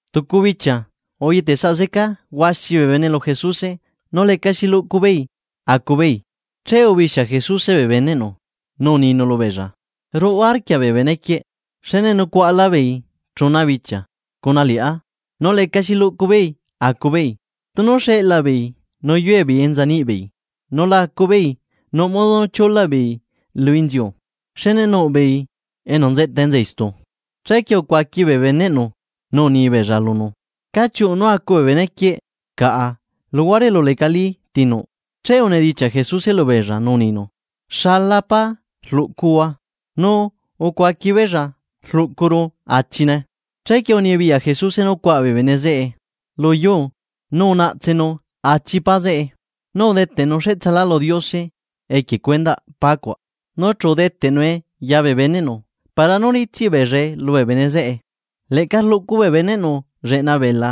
Tucu bichia uyetesaꞌ zeca huaxi bee bene lu Jesuse nu lecaxi luꞌcu beei acu beei, che ubixia Jesuse bee beneꞌnu nu uninu lubeella: ―Ruꞌu arquia bee benequieꞌ, xne nucuaꞌa labeei chuna bichia cuna liꞌá nu lecaxi luꞌcu beei caꞌa acu beei. Tunu xeꞌlaa beei nú yue beei enza niꞌ beei nu la acu beei nuꞌ modo nú chiulaꞌ beei lu inziu xne nuꞌ beei enu nzeꞌta enza istu. Chequie ucuaqui bee beneꞌnu nu uni beella lunu: ―¿Cá chiuꞌu nú acu bee benequieꞌ caꞌa luhuare elu lecalí ti nuꞌ? Che unidichiaꞌ Jesuse lubeella nú uninu: ―¿Xala pá rluꞌcuhua? Nu ucuaqui beella: ―Rlucuru achine. Chequie unibiyaꞌ Jesuse nú cuaꞌa bee bene zeꞌe lu yuu nu unaꞌtsenu achi pá zeꞌe, nu udeteꞌnu cheꞌtsalá lu Diose equie cuendaꞌ pá cuaꞌ, nu chu udeteꞌnue ya bee beneꞌnu para nú ritsiꞌ beellae lubee bene zeꞌe. Leꞌca rluꞌcu bee beneꞌnu lleꞌna bee bela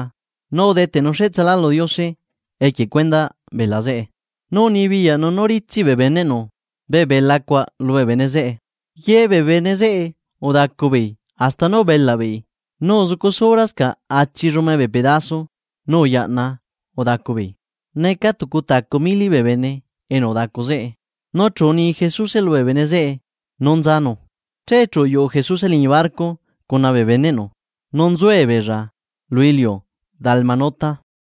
nu udeteꞌnu cheꞌtsalá lu Diose equie cuendaꞌ bela zeꞌe, nu unibiyaꞌnu nú ritsiꞌ bee beneꞌnu bee bela cuaꞌ lubee bene zeꞌe. Ye bee bene zeꞌe udacu beei hasta nú ubelaꞌ beei nu uzucu sobrascaꞌ achi llume bee pedaso nú uyaꞌna udacu beei. Neca tucu tacu mili bee bene enu udacu zeꞌe nu chu uni Jesuse lubee bene zeꞌe nú nzanu. Che chu uyuꞌu Jesuse liñi barco cuna bee beneꞌnu nu nzuebeella lu iliu Dalmanuta.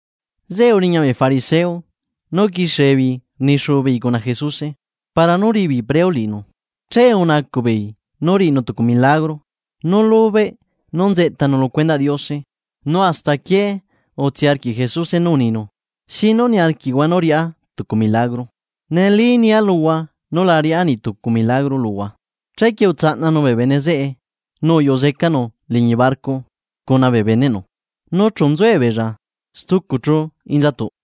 Zeꞌe uriña bee fariseo nu uquixie beei rnixuu beei cuna Jesuse, para nú riꞌi beei preo liꞌinu, che unacuꞌbeei nú riꞌinu tucu milagro nú lubeꞌ nú nzeꞌtanu lu cuendaꞌ Diose. Nu hasta aquié utsii arquiꞌ Jesuse nú uninu: ―¿Xi nú niarquiꞌhua nú riꞌá tucu milagro? Neli nia luhua nú la riꞌá niꞌ tucu milagro luhua. Chequie utsaꞌnanu bee bene zeꞌe nu uyuꞌu zecanu liñi barco cuna bee beneꞌnu nu chu nzuebeella stucu chú inzatuꞌ.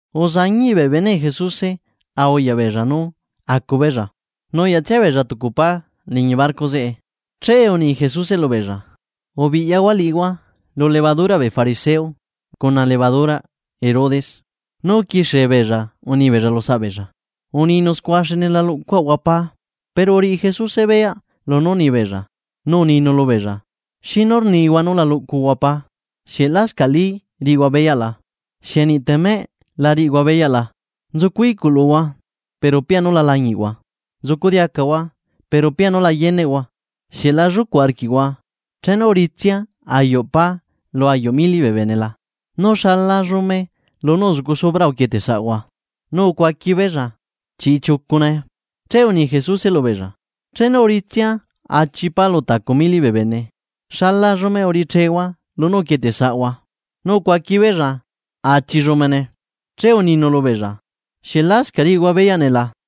Uzañiꞌ bee beneꞌ Jesuse a uyaꞌ beella nú acu beella nuyaꞌtsia beella tucu pá liñi barco zeꞌe. Che uni Jesuse lubeella: ―Ubiꞌyahua liꞌihua, lu levaduraꞌ bee fariseo cuna levaduraꞌ Herodes. Nu uquixie beella uni beella lusaꞌbeella: ―Uninu scua xne la luꞌcuaꞌahua pá. Pero uriꞌi Jesuse beyaꞌ lunú rni beella, nu uninu lubeella: ―¿Xi nú rnihua nú la luꞌcuhua pá? ¿Xieꞌ lascaꞌlí riꞌihua beyaꞌ la? ¿Xieꞌ niꞌ temeꞌ la riꞌihua beyaꞌ la? Nzucu iꞌculuhua pero pianu la lañiꞌhua, nzucu diacahua pero pianu la yeneꞌhua ¿Xieꞌ la llucuꞌ arquiꞌhua, chenu uritsia ayuꞌ pá lu ayuꞌ mili bee bene la? ¿Nu xala llume lunú uzucu sobra uquieteꞌsaꞌhua? Nu ucuaqui beella: ―Chiꞌchiucune. Che uni Jesuse lubeella: ―Chenu uritsia achi pá lu tacu mili bee bene, ¿xala llume uriꞌichehua lunú uquieteꞌsaꞌhua? Nu ucuaqui beella: ―Achi llumene. Chequie uninu lubeella: ―¿Xieꞌ lascaꞌ riꞌihua beyaꞌ nee la?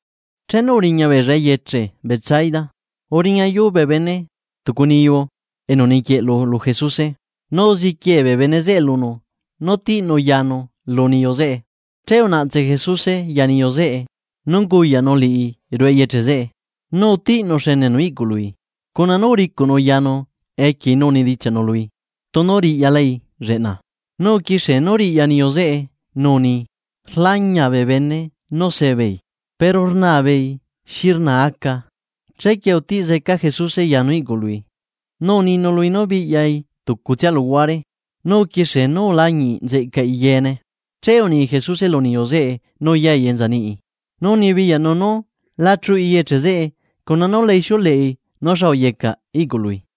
Chenu uriña beella eyeche Betsaida, uriñayu bee bene tucu niyu enu niquieꞌlu lu Jesuse, nu uziquie bee bene zeꞌe lunu nú tiꞌnu yanu lu niyu zeꞌe. Che unaꞌtse Jesuse ya niyu zeꞌe nu unguyaꞌnu liꞌi ruꞌu eyeche zeꞌe. Nu utiꞌnu xenenu iꞌcului, nu uricuꞌnu yanu equiei nu unidichiaꞌnu lui tunu riꞌyalai lleꞌna. Nu uquixie nú riꞌya, niyu zeꞌe nu uni: ―Rlañia bee bene nú sebeei. Pero rnaa beei xi rnaa aca. Chequie utiꞌ zeca Jesuse yanu iꞌcului, nu uninu lui nú biꞌyai tucutsia luhuare nu uquixie nú ulañiꞌ nzeꞌcaꞌi yeene. Che uni Jesuse lu niyu zeꞌe nú yai enza niꞌi, nu unibiyaꞌnu nú la chuꞌi eyeche zeꞌe cuna nú la ixiuleꞌi lu niꞌ tucu bee bene nú xa uyeca iꞌcului.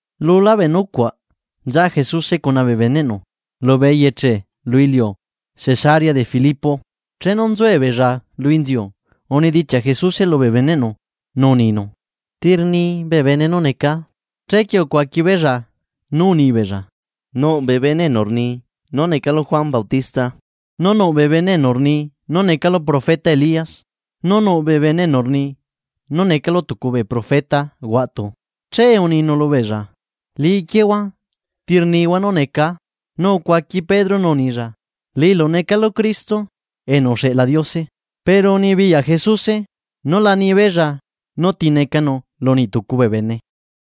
Lu lá bee nucuaꞌ, nza Jesuse cuna bee beneꞌnu lubee eyeche lu iliu Cesarea de Filipo. Chenu nzuebeella lu inziu, unidichiaꞌ Jesuse lubee beneꞌnu nú uninu: ―¿Ti rni bee bene nú necaa? Chequie ucuaqui beella nú uni beella: ―Nuꞌ bee bene enu rni nú necalu Juan Bautista, nu nuꞌ bee bene enu rni nú necalu profeta Elías, nu nuꞌ bee bene enu rni nú necalu tucu bee profeta huaꞌtu. Che uninu lubeella: ―Liꞌi quiehua, ¿ti rnihua nú necaa? Nu ucuaqui Pedro nú unilla: ―Liꞌilu necalu Cristo enu uxeꞌla Diose. Pero unibiyaꞌ Jesuse nú la ni beella nú ti necanu lu niꞌ tucu bee bene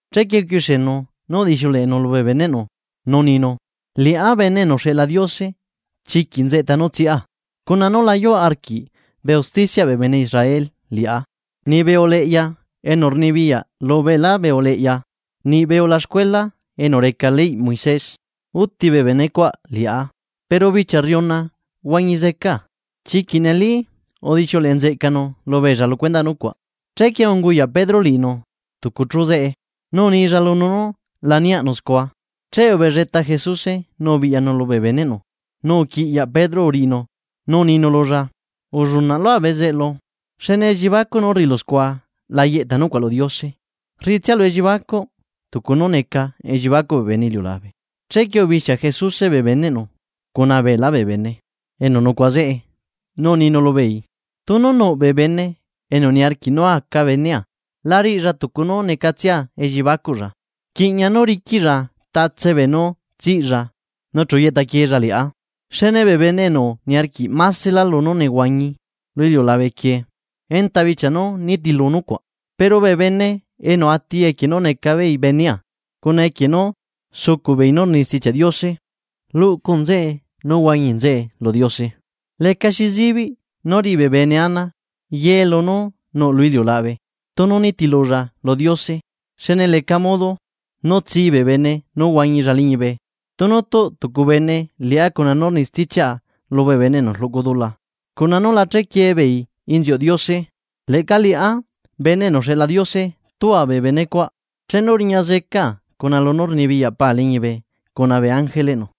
Chequie uquixienu nú udixiuleꞌenu lubee beneꞌnu nú uninu: ―Liꞌá Bene enu uxeꞌla Diose chiquiꞌ nzeꞌta nú nehuana zecaa, cuna nú la yuꞌ arquiꞌ bee usticiaꞌ bee bene Israel liꞌá, niꞌbee uleꞌya enu rnibiyaꞌ lu beelá bee uleꞌya niꞌbee ulaxcuela enu reca leyꞌ Moisés, úti bee benecuaꞌ liꞌá, pero bichia rriuna huañi zecaa. Chiquiꞌ neli udixiuleꞌe nzeꞌcanu lubeella lu cuendaꞌ nucuaꞌ. Chequie unguyaꞌ Pedro liꞌinu tucu chu zeꞌe nu unilla lunu nú la niaꞌnu scua. Che ubelleta Jesuse nu ubiꞌyanu lubee beneꞌnu, nu uquiꞌyaꞌ Pedro uriꞌinu, nú uninu lulla: ―¡Ullunaꞌ lua bezeꞌlu! Xne elliebacuꞌ nú rriꞌilu scua la yeꞌta nucuaꞌ lu Diose, rriꞌi tsialu elliebacuꞌ tucu nú neca elliebacuꞌ bee bene iliulabe. Chequie ubixia Jesuse bee beneꞌnu cuna beelá bee bene enu nucuaꞌa zeꞌe, nu uninu lubeei: ―Tunu nuꞌ bee bene enu niarquiꞌ nú aca benea, la riꞌilla tucu nú necatsia elliebacuꞌlla, rquiꞌña nú riquiꞌlla beenú nehuana zecalla che chu yeꞌta quieella liꞌá. Xne bee bene enu niarquiꞌ másela lunú nehuañi lu iliulabe quieꞌ enta bichia nú nitilu nucuaꞌ, pero bee bene enu ati equie nú neca beei benea cuna equie nú uzucuꞌbeei nú rni Stichiaꞌ Diose, luꞌcu nzeꞌe nú huañi nzeꞌe lu Diose. Lecaxi zibiꞌ nú riꞌi bee bene ana ye lunú nuꞌ lu iliulabe, tunu unitilulla lu Diose. Xne leca modo, nú tsi bee bene nú huañilla liñibe. Tunu tuꞌ tucu bene liꞌá cuna nú rni stichiaꞌa lubee bene enu rluꞌcu dula, cuna nú la chequiee beei inziuꞌ Diose leꞌca Liꞌá Bene enu uxeꞌla Diose tua bee benecuaꞌ chenu riña zecaa cuna lunú rnibiyaꞌ Pa liñibe cuna bee ángeleꞌnu.